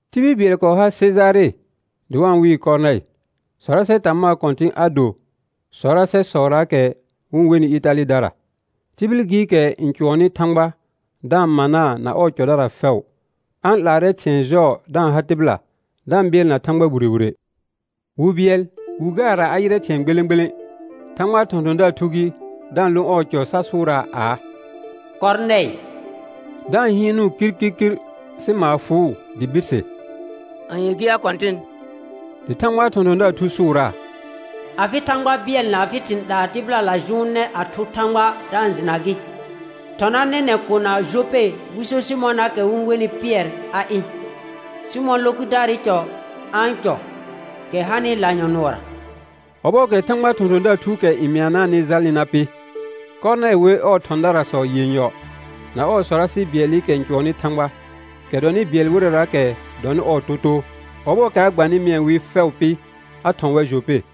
Tibil Bɩɛl kɔɔ har Sejare dɩ wa-n wɩɩ Kɔrnɛɩ. Sɔrasɛ tamaa kɔ̃tɩ̃ a do sɔrasɛsɔraakɛ wɩ-n wenɩ Ɩtalɩdara. Tihil gɩɩkɛ n cʋɔnnɩ Thãgba da-n manaa na ɔɔ cɔdara fɛʋ; a-n 'laarɛ thɩ̃ɛ jɔɔ da-n ha tɩbɩla da-n bɩɛlna Thãgba wire wire. Wi bɩɛl wi gaara a yɩrɛ thɩ̃ɛ gbelẽ gbelẽ; Thãgbaa thɔ̃thɔ̃daar thu gɩ da-n lo ɔɔ cɔ sa sʋʋraa aa: Kɔrnɛɩ, da-n hɩɩnʋʋ kirkirkir sɩ maar fʋʋ dɩ birse: Anye gɩ ya Kɔ̃tɩn? Dɩ Thãgbaa thɔ̃thɔ̃daar thu sʋʋraa: Afɩ Thãgba bɩɛl na afɩ thɩ̃ 'laa tɩbɩlala jʋʋnɛ a thʋ Thãgba da-n jɩna gɩ. Thɔna nɛnɛ̃ kona Jope wɩ so Sɩmɔnaakɛ wɩ-n wenɩ Pɩɛr a ɩ̃. Sɩmɔ̃ lo kʋdaarɩ cɔ a-n cɔ, kɛ hanɩ lanyɔ̃ nʋɔra. Ɔbɔɔkɛ Thãgbaa thɔ̃thɔ̃daar thuukɛ n mɩanaanɩ jalnɩ na pɩ, Kɔrnɛɩ wer ɔɔ thɔ̃darasɔ yenyɔ na ɔɔ sɔrasɩ bɩɛlɩkɛ n cʋɔnnɩ Thãgba, kɛ dɔnɩ bɩɛl wɩrɛraakɛ dɔnɩ ɔɔ totoo; ɔbɔɔkɛ a gbanɩ mɩɛ wɩ fɛʋ pɩ, a thɔ̃ wɛr Jope.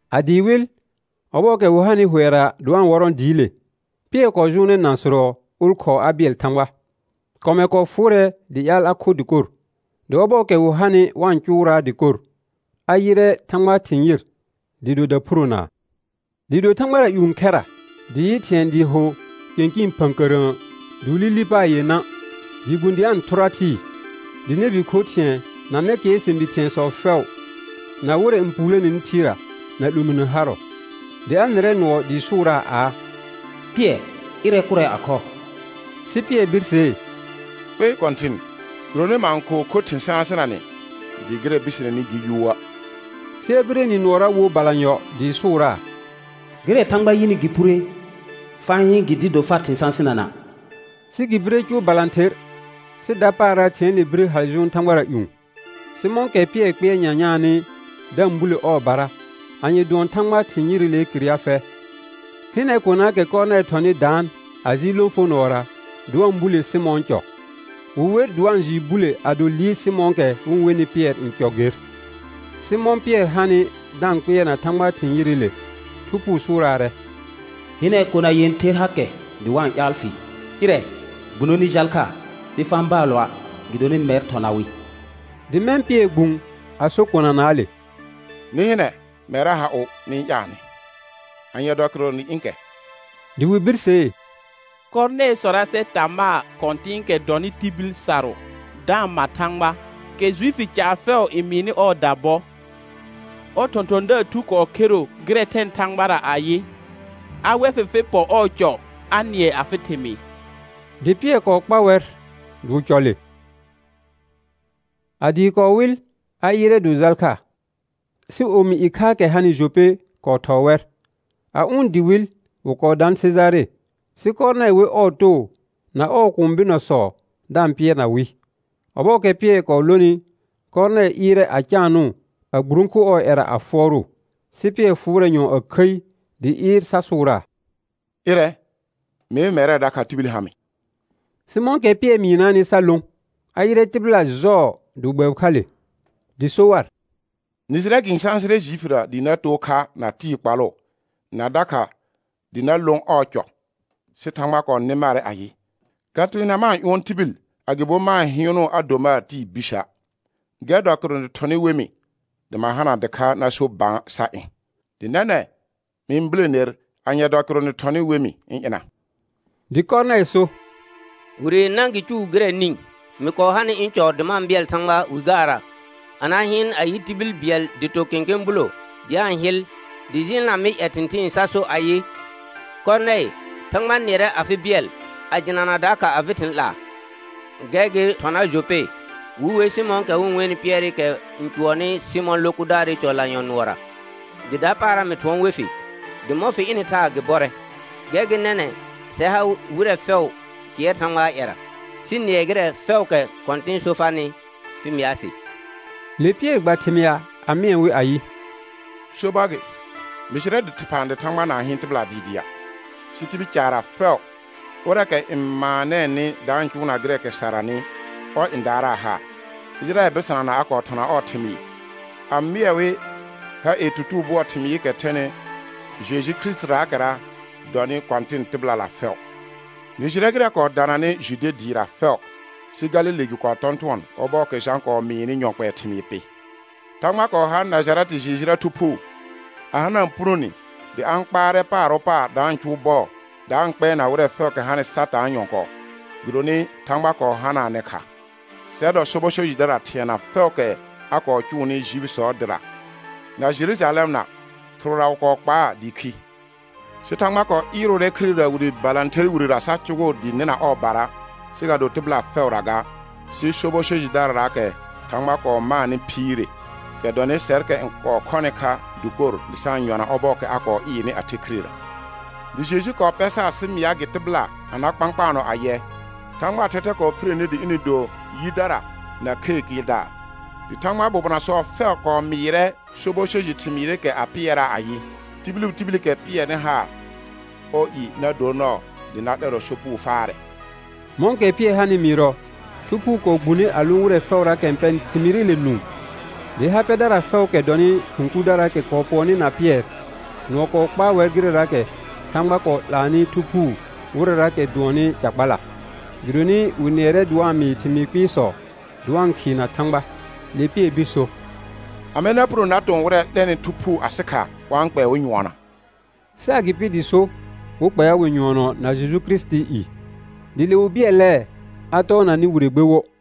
A dɩɩ wɩl, ɔbɔɔkɛ wɩ hanɩ hʋɛra dɩ wa-n wɔrɔ̃ dɩɩle, Pɩɛr kɔɔ jʋʋnɛ nãsʋrɔ ʋlkhɔɔ a bɩɛl Thãgba. Kɔmɛr kɔɔ fʋʋrɛ dɩ ƴaal a kho dɩkor, dɩ ɔbɔɔkɛ wɩ hanɩ wa-n cʋʋraa dɩkor, a yɩrɛ Thãgbaa thɩ̃ yɩr dɩɩ do daphuronaa, dɩɩ do thãgbara ƴũ khɛra dɩ yɩ thɩ̃ɛ dɩɩ ho kɩ̃kɩɩn phə̃kərə̃ə dɩ wɩ li li paar yenã dɩɩ gbũ dɩ a-n thʋra thɩɩ, dɩ nɛbi kho thɩ̃ɛ, na nɛkɩɛr sɛ̃bi thɩ̃ɛsɔ fɛʋ, na wɩrɛ n puuloneni thɩɩra na 'lominə harɔ. Dɩ a nɩrɛ nʋɔ dɩɩ sʋʋraa aa: Pɩɛr, ɩrɛ kʋrɛ a khɔ. Sɩ Pɩɛr birsee: Kpei Kɔ̃tɩn, gɩdonɩ ma-n kɔɔ kho thɩ̃ sãsɩnanɛ dɩ gɩrɛ biseneni gɩ yuuə'. Sɩ a bire nɩ nʋɔra wo balanyɔ dɩɩ sʋʋraa: Gɩrɛ Thãgba yɩnɩ gɩ phure, fa-n hɩɩn gɩ dɩɩ do far thɩ̃ sãsɩnana'. Sɩ gɩ bire cʋʋ balãther, sɩ dapaara thɩ̃ɛɛle bire hal jʋʋn thãgbara ƴũ. Sɩ mɔ̃kɛ Pɩɛrɩ kpɩɛr nyanyaanɩ da-n bule ɔɔbara, anye dʋɔn Thãgbaa thɩ̃ yɩrɩlee kɩr ya fɛ, hɩnɛ konaakɛ Kɔrnɛɩ thɔnɩ daan a jɩɩl lõfonʋɔra, dɩ wa-n bule Sɩmɔ̃ɔ cɔ. Wɩ wer dɩ wa-n jɩɩ bule ado liir Sɩmɔ̃ɔkɛ wɩ-n wenɩ Pɩɛr n cɔ ger. Sɩ mɔ̃ Pɩɛr hanɩ da-n kpɩɛrna Thãgbaa thɩ̃ yɩrɩle, Thu Phuu sʋʋraarɛ: Hɩnɛ, kona yẽther hakɛ dɩ wa-n ƴaal fɩ. Ɩrɛ, gbuno nɩ jal kha, sɩ fa-n baalɔa' gɩdonɩ mɛr thɔna wɩ. Dɩ mɛ̃ Pɩɛr gbũ a so konanaale: Nɩ hɩnɛ, mɛrra ha ʋ nɩ-n ƴaalnɩ, anye dɔ kɩrʋ nɩ ɩ̃ kɛ? Dɩ wɩ birsee: Kɔrnɛɩ sɔrasɛ tamaa kɔ̃tɩ̃ɩkɛ dɔnɩ tibil sarʋ da-n ma Thãgba, kɛ Juifi caar fɛʋ n mɩɩnɩ ɔɔda bɔ, ɔr thɔ̃thɔ̃daar thu kɔɔ khero gɩrɛ thɛnɩ Thãgbara ayɩ, a wɛ fɩ fɩ pɔ ɔɔ cɔ a nɩɛ afɩ thɩmɩɩ. Dɩ Pɩɛr kɔɔ kpa wɛr dɩ wɩ cɔ le. A dɩɩ kɔɔ wɩl, a ɩɩrɛ dɩ wɩ jal kha. Sɩ omi ɩkhaakɛ hanɩ Jope kɔɔ thɔɔ wɛr. A ʋ̃ dɩ wɩl, wɩ kɔɔ daan Sejare. Sɩ Kɔrnɛɩ wer ɔɔ too na ɔɔ kũu bɩnɔsɔ da-n pɩɛrna wɩ. Ɔbɔɔkɛ Pɩɛr kɔɔ lonɩ, Kɔrnɛɩ ɩɩrɛ a caanʋʋ a gburõku ɔɔ ƴɛra a fʋɔrʋʋ. Sɩ Pɩɛr fʋʋrɛ a khəi dɩ ɩɩr sa sʋʋraa: Ɩrɛ, mee mɛrɛ dakha tibil ha mɩ. Sɩ mɔ̃kɛ Pɩɛr mɩɩnaanɩ sa lõ, a yɩrɛ tɩbɩla jɔɔ dɩ wɩ gbɛbɩ kha le. Dɩ so war: Nɩ jɩrɛ gɩ-n sãsɩrɛ Juifira dɩ na too kha na tɩɩ kpalʋ, na dakha dɩ na lõ ɔɔ cɔ, sɩ Thãgba kɔɔ nɩ marɛ ayɩ, ga teena ma-n ƴʋɔn tibil, agɩbo ma-n hɩɩnʋʋ a do mar tɩɩ bisə'. Gɛr dɔ kɩrʋ nɩ thɔnɩ we mɩ dɩ ma hana dɩkha na so bã sa ɩ̃, dɩ nɛnɛ̃ mɩ-n bule ner, anye dɔ kɩrʋ nɩ thɔnɩ we mɩ ɩ̃ ɩna? Dɩ Kɔrnɛɩ so: Wire yenã gɩ cʋʋ gɩrɛ nĩ, mɩ kɔɔ hanɩ ɩ̃ cɔ dɩ ma-n bɩɛl Thãgba wi gaara, a na hɩɩn a yɩ tibil bɩɛl dɩ to kẽkẽ bulo dɩ a-n hɩl dɩ jɩɩlna mɩ ƴɛ thɩ̃thɩɩn sa so ayɩ: Kɔrnɛɩ, Thãgba nɩɛrɛ afɩ bɩɛl a jɩnana dakha afɩ thɩ̃ 'laa. Gɛr gɩ thɔna Jope wɩ we Sɩmɔ̃ɔkɛ wɩ-n wenɩ Pɩɛrɩkɛ n cʋɔnnɩ Sɩmɔ̃ lo kʋdaarɩ cɔ lanyɔ̃ nʋɔra. Dɩ dapaara mɩ thʋɔn we fɩ, dɩ mɔ̃ fɩ ɩnɩ thaa, gɩ bɔrɛ. Gɛr gɩ nɛnɛ̃ sɛr ha wɩrɛ fɛʋ kɩɛr Thãgbaa ƴɛra sɩ nɩɛ gɩrɛ fɛʋʋkɛ Kɔ̃tɩn so farnɩ fɩ mɩa sɩ. Le Pɩɛr gba thɩmɩa a mɩɛ wɩ ayɩ: Sobɔr gɩ, mɩ jɩrɛ dɩphã dɩ Thãgba na-n hɩɩn tɩbɩla dɩɩdɩa', sɩ tibil caarra fɛʋ, ʋrɛɛkɛ n maanɛɛnɩ da-n cʋʋna gɩrɛɛkɛ saranɩ, ɔr n daaraa haar. Ɩjɩrayɛl bɩsanana a kɔɔ thɔna ɔɔ thɩmɩɩ, a mɩɛ wɩ ha ie tutugo bʋɔɔ thɩmɩɩkɛ thɛnɩ Jeju Kirisitiraakɛra dɔnɩ Kɔ̃tɩn tɩbɩlala fɛʋ. Nɩ jɩrɛ gɩrɛ kɔɔ dananɩ Jude dɩɩra fɛʋ, sɩ Galile gɩ kɔɔ tɔ̃tʋɔn ɔbɔɔkɛ Jã kɔɔ mɩɩnɩ yɔ kpɛɛ thɩmɩɩr pɩ. Thãgba kɔɔ har Najarɛtɩ Jejura Thu Phuu, a hanaa punone dɩ a-n kpaarɛ paar wo paar da-n cʋʋ bɔɔ, da-n kpɛɛna wɩrɛ fɛʋʋkɛ hanɩ Satãa nyɔ̃kɔɔ, gɩdonɩ Thãgba kɔɔ hanaanɛ kha. Sɛr dɔ sobɔ so jɩdara thɩɛna fɛʋʋkɛ a kɔɔ cʋʋnɩ Juifisɔɔ dɩra na Jerujalɛmna, thɩrʋra wɩ kɔɔ kpaa dɩ khi. Sɩ Thãgba kɔɔ ɩɩrʋʋrɛ khirera wire balãther wirera sa cʋgʋʋ dɩ nɩna ɔɔbara, sɩ ga do tɩbɩla fɛʋra ga, sɩ sobɔ so jɩdararaakɛ Thãgba kɔɔ maanɩ phiire, kɛ dɔnɩ sɛrkɛ n kɔɔ khɔnɩ kha dɩkor dɩ sa-n yɔna ɔbɔɔkɛ a kɔɔ ɩɩrnɩ a the khirera. Dɩ Jeju kɔɔ pɛ sar sɩ mɩa gɩ tɩbɩla a na kpãkpaanɔ ayɛ, Thãgbaa thɛthɛ kɔɔ phire ni dɩ ɩnɩ do yidara na khee kɩɩldaar. Dɩ Thãgbaa bobonasɔ fɛʋ kɔɔ mɩɩrɛ sobɔ so jɩ thɩmɩɩrɩkɛ a pɩɛraa ayɩ: Tibil wo tibilikɛ pɩɛnɩ haar, ɔɔ i na dor nɔɔ dɩ na 'lɛrɔ sopugo faarɛ. Mɔ̃kɛ Pɩɛr hanɩ mɩɩrɔ, Thu Phuu kɔɔ gbune a lõ wɩrɛ fɛʋraakɛ n pɛnɩ thɩmɩɩrɩle nũu. Dɩ ha pɛdara fɛʋʋkɛ dɔnɩ khʋ̃ kurdaraakɛ kɔɔ pʋɔnnɩ na Pɩɛr, nʋɔ kɔɔ kpaa wɛr gɩrɛraakɛ Thãgba kɔɔ 'laanɩ Thu Phuu wɩrɛraakɛ dʋɔnnɩ ca kpala; gɩdonɩ wɩ nɩɛrɛ dɩ wa-n mɩɩ thɩmɩɩ kpɩɩsɔ dɩ wa-n khɩɩna Thãgba. Le Pɩɛr bir so: Amɛ na punone na tɔ̃ wɩrɛ 'lɛnɩ Thu Phuu asɩ kha wa-n kpɛɛ wɩ nyʋɔnɔa? Sɩ agɩpɩ dɩ so, wɩ kpɛa wɩ nyʋɔnɔ na Jeju Kirisitii i. Dɩ le wɩ bɩɛlɛɛ a tɔɔna nɩ wire gbe wo.